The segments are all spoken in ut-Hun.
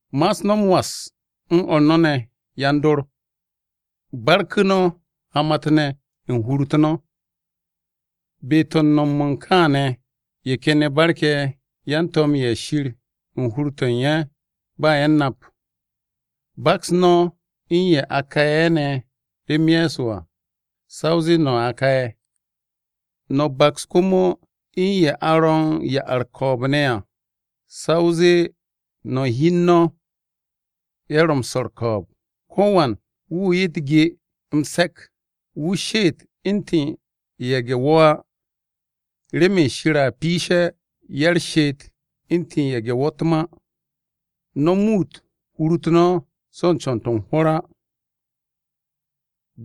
Ma'as no̱ m-was u̱n o̱r no̱ ne̱ yan-dor. Barku̱ no̱ hamat-ne̱ u̱n hur-u̱t no̱. Be-to̱ u̱n no̱m-mo̱ u̱n kaane̱, ye̱ ken ye̱ barke̱ yan-to̱m-ye̱ Shir u̱n hur-to̱ u̱n ye̱ ba ye̱ u̱n nap. Baks no̱ u̱n ye̱ a ka'e̱ ne̱ rem Ye̱so à, sa o zee no̱ a ka'e̱. No̱ baks komo u̱n ye̱ a ro̱ u̱n ya-u̱r-ko̱o̱b ne̱ à. Sa o zee no̱ u̱n hi u̱n no̱ ye̱ ro̱ m-swo̱ u̱r-ko̱o̱b. Ko̱wan wu̱ 'ye u̱t-ge m-se̱k, wu̱ she'et u̱ntu̱n ye̱ge̱-wo̱ á, remen Shir a piishe̱ ya-u̱r-she'et u̱ntu̱n ye̱ge̱-wo̱ u̱t-ma. No̱ muut hur-u̱t no̱ so̱ u̱n co̱n-to̱ u̱n hwo̱r á.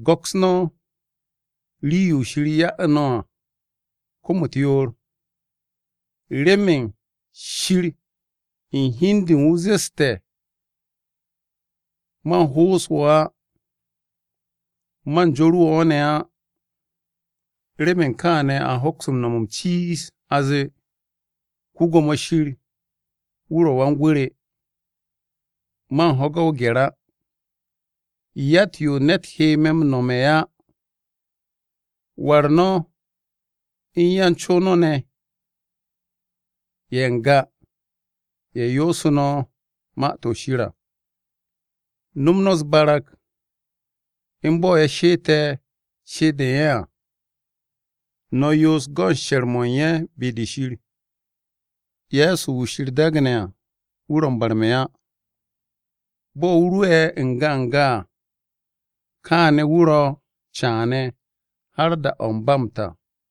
Go̱ks no̱ rii-yo Shir ya'u̱ no̱ à, kom-u̱t yoor, remen Shir u̱n hi u̱n de u̱n wu̱ zeste̱, “Man m-ho'os wo̱ á. Man joru̱ wo̱ ne̱ á.” Remen kaane̱ a hoks no̱m m-ciiz a zee, “Yawe wu̱ ro̱ Wan-gwu̱ re. Man ho̱ge̱ o-gye̱r á. Yatt-yo ne̱t he me̱ m-no̱me̱ á.” War no̱ u̱n yan-co no̱ ne̱ ye̱ n-ga ye̱ yoosu̱ no̱ Ma-to̱ Shir à. No̱m no̱ u̱s-barag u̱n bo̱ ye̱ she'ete̱ she'et-de u̱n ye̱ à, no̱ yoos go̱n she̱r-mo̱ u̱n ye̱ be-de Shir. Ye̱so Kiristi wu̱ ro̱ m-barme̱ á. Bo̱ wu̱ ro'e̱ n-ga n-ga à, kaa wu̱ ro̱ caane̱ har da-o̱ u̱n ba m-ta.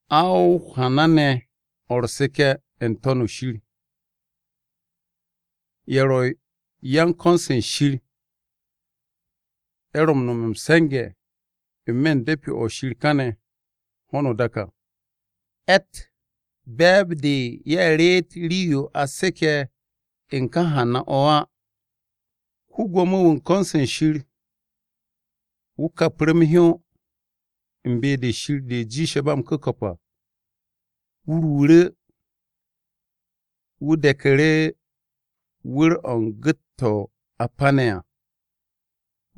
A o-hana ne̱ o̱ u̱r-seke̱ n-To̱n shir. Ye̱ ro̱ yan-ko̱n-se Shir ye̱ ro̱ m-no̱m m-se̱nge̱ n-me̱ u̱n de̱pi-o̱ Shir kàne̱ ho̱no o-dak à, ye̱tt be̱e̱b-de ye̱ reet rii-yo a seke̱ u̱n ka hana-o̱ á. Ko-Gwo̱mo-wu̱ u̱n ko̱n-se Shir wu̱ kapru̱ m-hyó u̱n “Be-de u̱n Shir de jiishe̱ ba m-ku̱ko̱p à,” wu̱ ruuru̱, wu̱ de̱ku̱ru̱ wu̱r-o̱ u̱n gu̱t-to̱ a pane̱ à,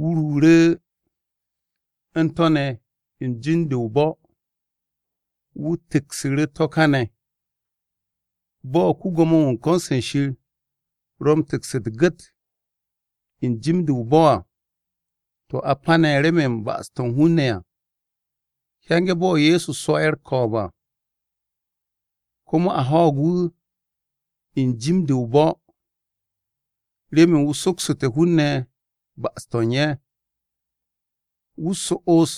wu̱ ruuru̱ u̱n to̱ ne̱ n-jim de o-bo̱, wu̱ tu̱ksu̱ru̱ to̱ kane̱. Bo̱ ko-Gwo̱mo-wu̱ u̱n ko̱n-se Shir ro̱ m-tu̱ks u̱t-gu̱t n-jim de o-bo̱ à, to̱ a pane̱ remen ba'as-to̱ u̱n hun-ne̱ à. Hyenge̱ bo̱ Ye̱so swo̱'e̱ u̱r-ko̱o̱b à, komo a ho̱o̱g wu̱ n-jim de o-bo̱ remen wu̱ soksu̱té̱ hun-ne̱ ba'as-to̱ u̱n ye̱. Wu̱ so'os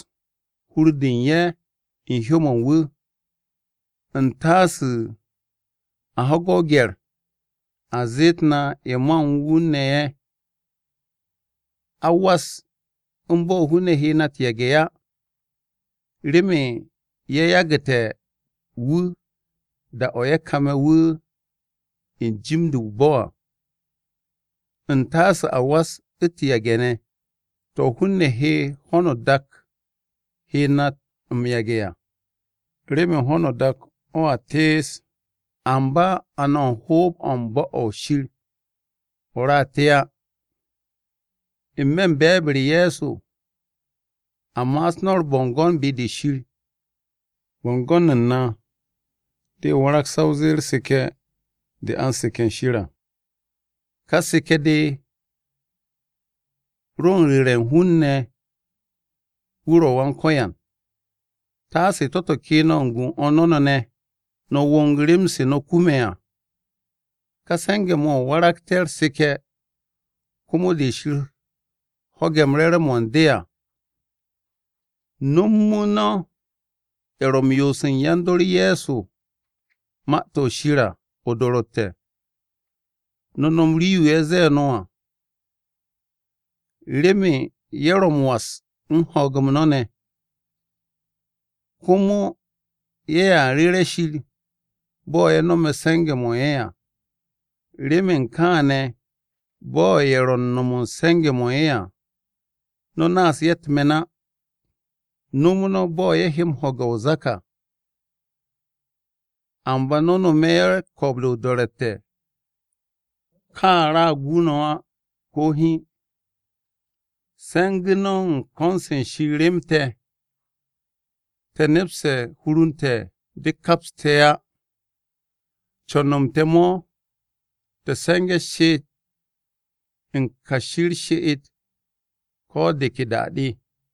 hur-de u̱n ye̱ u̱n hyó-mo̱ u̱n wu̱. U̱ntasu̱ a ho̱ge̱ o-gye̱r a zeet na ye̱ ma u̱n wu̱ ne̱ ye̱. A was u̱n bo̱ hun-ne̱ he na u̱t-yage̱ á, remen ye̱ yagu̱te̱ wu̱ da-o̱ ye̱ kame̱ wu̱ n-jim de o-bo̱ à. U̱ntasu̱ a was u̱t-yage̱ ne̱, to̱ hun-ne̱ ye̱ hon dak he na m-yage̱ á. Remen ho̱no o-dak o̱a te'es. Amba a no̱ u̱n hoob-o̱ u̱n bo̱-o̱ Shir o̱ ra te á. N-me̱ be̱e̱b-u̱r Ye̱so, a ma'as no̱ u̱r-bo̱ngo̱n be-de Shir, bo̱ngo̱n u̱n na de warag sa o zee u̱r-seke̱ de a u̱n seke̱ u̱n Shir à. Ka seke̱-de ro u̱n ru̱ru̱ hun-ne̱ wu̱ ro̱ Wan-Ko̱yan. Taase to̱-to̱ ke no̱ u̱n gu u̱n o̱r no̱ ne̱ ne̱, no̱ wo̱ng rem-se no̱ kume̱ à. Ka se̱nge̱-mo̱ mo̱ waragte̱ u̱r-seke̱ komo de Shir ho̱ge̱ re̱re̱m-mo̱ u̱n de à. Nomu̱ no̱ ye̱ ro̱ m-yoose̱ yan-dor Ye̱so Ma-to̱ Shir à o-do̱ro̱tte̱, no̱ nom rii-yo ye̱ zee no̱ à, remen ye̱ ro̱ m-was u̱n ho̱o̱g-m no̱ ne̱. Komo ye̱a ru̱re̱ Shir bo̱ ye̱ no̱me̱ se̱nge̱-mo̱ u̱n ye̱ à. Remen kaane̱ bo̱ ye̱ ro̱ u̱n no̱m u̱n se̱nge̱-mo̱ ye̱ à no̱ naas ye̱ u̱t-me̱n á. No̱m no̱ bo̱ ye̱ he m-ho̱ge̱ o-zak à. Amba no̱ no̱me̱ ye̱ ko̱o̱b-de o-do̱ro̱tte̱, ka ra gu no̱ á, ko̱ hiin. Se̱ngu̱ no̱ u̱n ko̱n-se Shir rem te̱. Te̱ nepste̱ hur u̱n te̱ de kaps te̱ á. Co̱n-m te̱ mo̱ te̱ se̱nge̱ she'et u̱n kashi u̱r-she'et ko̱ de ke da-de.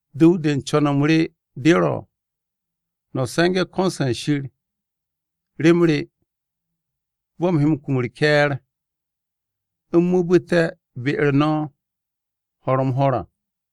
Du̱w-de u̱n co̱n-m re de ro̱ no̱ se̱nge̱ ko̱n-se Shir rem re bo̱ u̱m he kum u̱r-ke̱e̱r u̱m mu̱u̱bu̱te̱ be-u̱r no̱ ho̱r-m-ho̱r à.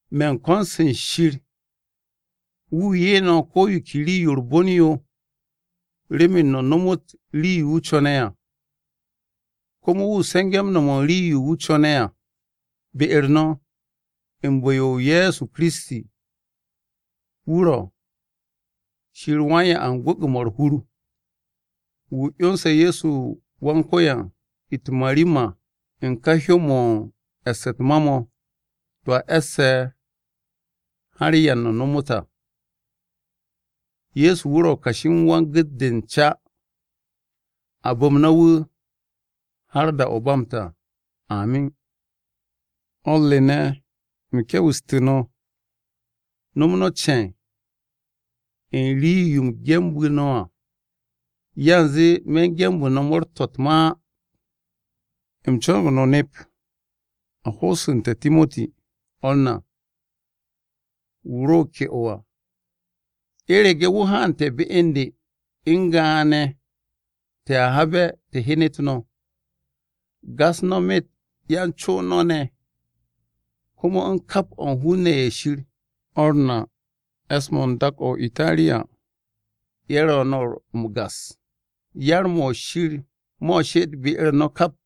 Me̱ u̱n ko̱n-se Shir wu̱ 'ye no̱ ko̱ yo ke rii-yo u̱r-bon yo remen no̱ nomot rii-yo wu̱ co̱ne̱ à. Komo wu̱ se̱nge̱ m-no̱m rii-yo wu̱ co̱ne̱ à, be-u̱r no̱ u̱n bu̱-yo Ye̱so Kiristi. Wu̱ ro̱: Shir wan-'ya u̱n gwu̱gwu̱-mo̱ u̱r-hur! Wu̱ 'yonse̱ Ye̱so Wan-Ko̱yan u̱t-marimar u̱n ka hyó-mo̱ u̱n e̱ss u̱t-ma mo̱, to̱ a e̱sse̱ har da-o̱ ba m-ta à! Ye̱so wu̱ ro̱ kashi u̱n wan-gu̱t-de u̱n ca! A bu̱m no̱ wu̱ har da-o̱ ba m-ta, amin. O̱r re ne̱, u̱m ke̱we̱stu̱ no̱, no̱m no̱ ce̱e̱n u̱n rii-yo u̱m genbu̱ no̱ à. Yanze me̱ genbu̱ no̱ mo̱o̱r-to̱ u̱t-ma á. U̱m co̱no̱g no̱ nep a ho'osu̱nte̱ Timoti, o̱r na, wu̱ ro ke'o à. U̱rege̱ wu̱ haante̱ be u̱n de, u̱n ga'ane̱ te̱a habe̱, te̱ hyenet no̱. Gas no̱ myet ya-co no̱ ne̱, komo u̱n kap o̱ hun-ne̱ ye̱ Shir. O̱r na e̱s-mo̱ u̱n dak-o̱ o-Itariya, ye̱ no̱ ro̱ m-gas. Yar-mo̱ Shir mo̱ u̱r-she'et be-u̱r no̱ kap!